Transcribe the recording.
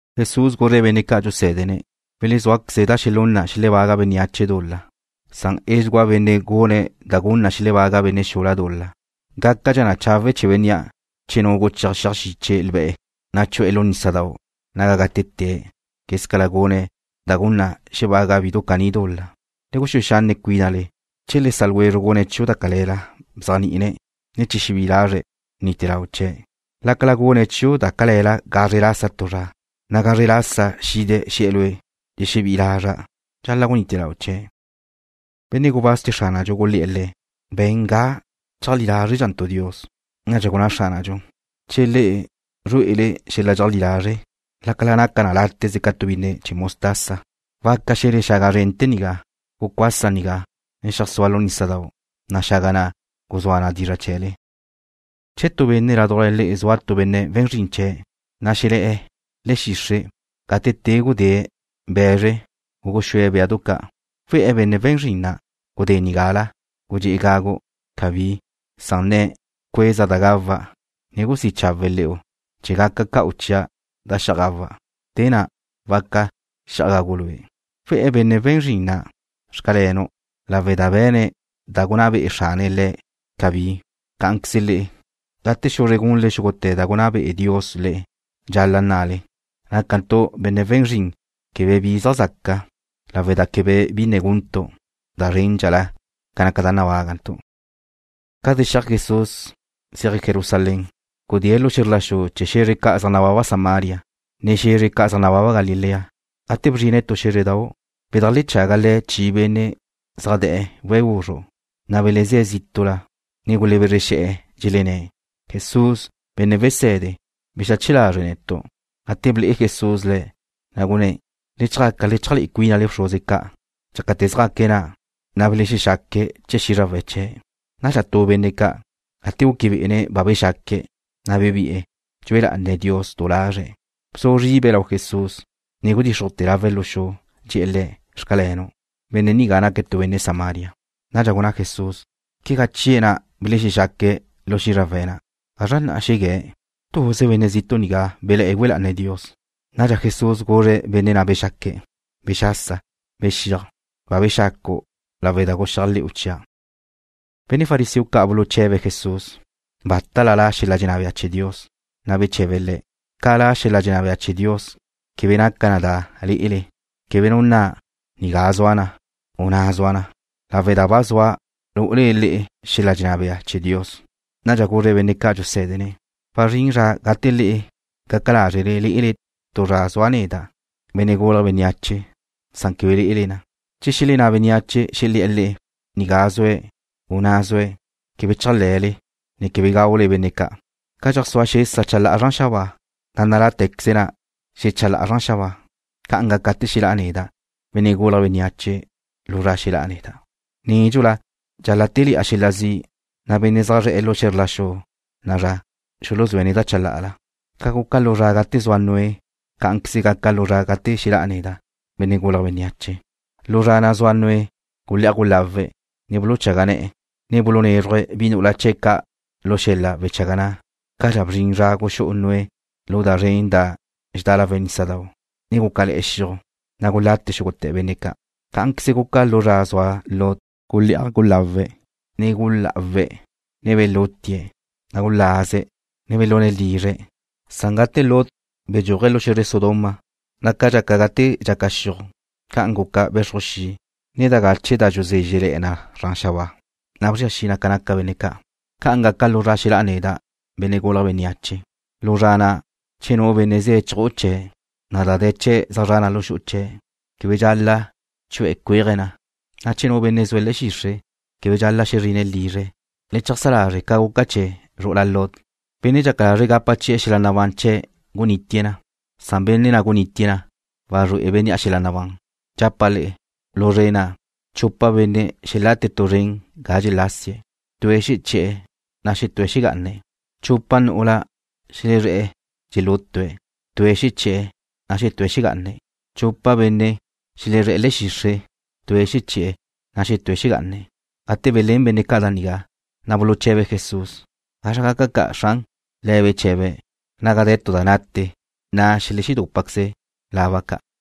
Jesús guzre̱' benne' ca' dxusé̱dene̱': ―Welezúaqueze da xelún na xelebaga bénneache dul-la, na' edxugúa bénnea' gune̱' da gun na xebaga benne' xula dul-la. Gácadxa chawe' chee̱ bénnea' che nu guchéaj xiaj xiche lbe̱', na' chu'e̱ lu nísadau' naga gátete̱' quézcala gune̱' da gun na xebaga bidu caní dul-la. Le guxúe xanne' cuínale. ’Che le sa' ljwezru' gune̱' chiu' da cale̱la, bzéajni'ine̱', na' che xebí'i lazre̱', bnite lau chee̱'. Lácala gune̱' chiu' da cale̱la gazre lasa tu zra, na' gazre lasa xide̱' xe̱'e̱ lue': “Dxexebí'i lazra'”, dxal-la' gunite lau' chee̱'. Benne' gubáz ca' chee̱ Xránadxu gulé̱'e̱ Le̱': ―Be̱n ga cheajlí lázredxantu' Dios. Nadxa gunná Xránadxu: ―Che le'e zrué'ele xel-la dxeajlí lazre', lácala naca na láteze ca tu bínnedu chee̱ mostaza, waca xe̱le xaga zrente̱ nigá: “Gucuasa nigá, ne xeajsúa lu nísadau',” na' xaga na' guzúa na dizra' chee̱le. ’Che tu benne' ládujla le'e zua tu benne' we̱n zrin chee̱', na' xelé̱'e̱ le̱'e̱ xixre' gate te gudée̱' be̱zre u guxúe̱' béadu ca', ¿we̱'e̱ benne' we̱n zrin na': “Gudé nigala, gudxé'e gagu'?” Cabí, san nne̱': “Bcueza da gawa', ne gusí' chawe' le̱'u chee̱ gaca ca'u chia' da xi'aj gawa'. Te na' waca xi'aj gagu' lue'.” ¿We̱'e̱ benne' we̱n zrin na': “Xcalenu'”, lawe' da be̱ne̱' da gunná be'e xrane̱' le̱'? Cabí. Cá'anqueze le'e, gate xuzre gunle xúgute̱ da gunná be'e Dios le'e, dxal-la' nnale: “Nácantu' benne' we̱n zrin quebe bi zaj zaca, lawe' da quebe bi ne guntu' da zréndxala ca naca da nabágantu'.” Ca zexíaj Jesús zéaje̱' Jerusalén, gudée̱' lu xe̱zr la xu chee̱ xe̱zre ca' zaj nababa Samaria, ne xe̱zre ca' zaj nababa Galilea. Gate bzrine̱' tu xé̱zredau', bedajlechaga Le̱' chi benne' zaj de̱'e̱ we̱' guzru', na' belezé̱' zítu'la, ne gulebezre xe̱'e̱, dxelenné̱': ―Jesús, Benne' Wese̱de, bexache lazre' netu'. Gate ble'e Jesús le̱', na' gunné̱': ―Le chjaca le cheajlué'e cuínale lau bxruze ca'. Dxácate̱ zjaque̱' na', na' belexexaque̱' chee̱ xízrawe̱' chee̱'. Nadxa tu benne' ca', gate guque bé'ene̱' ba bexaque̱', na' bebi'e̱, dxue lá'ane̱' Dios du lazre̱'. Bzu zribe̱' lau Jesús, ne gudíxrujte̱' lawe̱' lu xu, dxe̱'e̱ Le̱': “Xcalenu'.” Benne' nigá naque̱' tu benne' Samaria. Nadxa gunná Jesús: ―¿Quegá chie̱' na' belexexaque̱' lu xízrawe̱' na'? ¿Gazra na' xegué̱'? ¿Tuze benne' zitu' nigá belá' güe lá'ane̱' Dios? Nadxa Jesús guzre̱' benne' na' bexaque̱': ―Bexasa, bexíaj. Ba bexacu' lawe' da guxéajle̱'u chia'. Benne' fariseo ca' buluche̱be̱' Jesús bátala la' xel-la dxenná bea chee̱ Dios, na' beche̱be Le̱': ―Ca la' xel-la dxenná bea chee̱ Dios quebe naca na da lé'ele. Quegá nu nna: “Nigá zua na”, u “Na' zua na”, lawe' da ba zua lu'ule le'e xel-la dxenná bea chee̱ Dios. Nadxa guzre̱' benne' ca' dxusé̱dene̱': ―Wazrín zra gate le'e gaca lázrele lé'ele tu zra zua' neda', Benne' Gulje̱' Bénneache, na' quebe lé'ele na. Che xelenná bénneache, xelé̱'e̱ le'e: “Nigá zue̱'”, u: “Na' zue̱'”, quebe chéajle, ne quebe gaule benne' ca'. Ca dxeajsúa xesa chalá'a zran xabáa, na' nalá'te̱queze na xechalá'a zran xabáa, ca'an gaca gate xelá' neda', Benne' Gulje̱' Bénneache, lu zra xelá'a neda'. Nédxula dxal-la' téle̱'a xel-la zi', na' benne' zaj zre̱'e̱ lu zra na'a zra xuluzúe̱' neda' chalá'ala. Ca guca lu zra gate zua Noé, cá'anqueze gaca lu zra gate xelá'a neda', Benne' Gulje̱' Bénneache. Lu zra na' zua Noé gulé'aj gulawe̱', ne buluchaga ne̱'e̱, ne bulunézruje̱' bi nu'ula chee̱' ca' lu xel-la wechaga na', cadxa bzrin zra guxú'u Noé lu da zren na' da dxedá lawe' nísadau', na' gúcale̱'e̱ xiuj, na' gulate xúgute̱ benne' ca'. Cá'anqueze guca lu zra zua Lot, gulé'aj gulawe̱', ne gulá'awe̱', ne belútie̱', na' gulaze̱', ne belune̱' lizre̱', na' gate Lot bedxúaje̱' lu xe̱zre Sodoma, na' ca dxaca gate dxaca xiuj, ca'an guca be̱xruj xi', ne da gache da dxuzézxele̱'e zran xabáa, ne bzria xi na ca naca benne' ca'. Ca'an gaca lu zra xelá'a neda', Benne' Gulje̱' Bénneache. ’Lu zra na', che nu benne' ze̱' chju'u chee̱', na' da de̱ chee̱' zra na lu xu'u chee̱' na', quebe dxal-la' chu'e̱ cuéaje̱' na, na' che nu benne' zue̱' le̱'e̱ xixre', quebe dxal-la' xezrine̱' lizre̱'. Le cheajsá lazre' ca guca chee̱ zru'ula Lot. Benne' dxaca lazre̱' gapa chi'e̱ xel-la nabán chee̱' gunitie̱' na, na' bénnea' wdee̱' na, wazrué'e bénnea' xel-la nabán. ’Dxapa' le'e, lu zre na', chupa benne' xelate̱' tu zren ga dxelase̱'. Tue̱' xeché̱'e̱, na' xetúe̱' xegá'ane̱'. Chupa nu'ula xelezré̱'e̱ dxelútue̱'. Tue̱' xeché̱'e̱, na' xetúe̱' xegá'ane̱'. Chupa benne' xelezré̱'e̱ le̱'e̱ xixre'. Tue̱' xeché̱'e̱, na' xetúe̱' xegá'ane̱'. Gate belén benne' ca' da nigá, na' buluche̱be̱' Jesús: ―¿Gazra gaca ca', Xran? Le̱' beche̱be̱': ―Naga de̱ tu da nate, na' xeledúpaqueze laba ca'.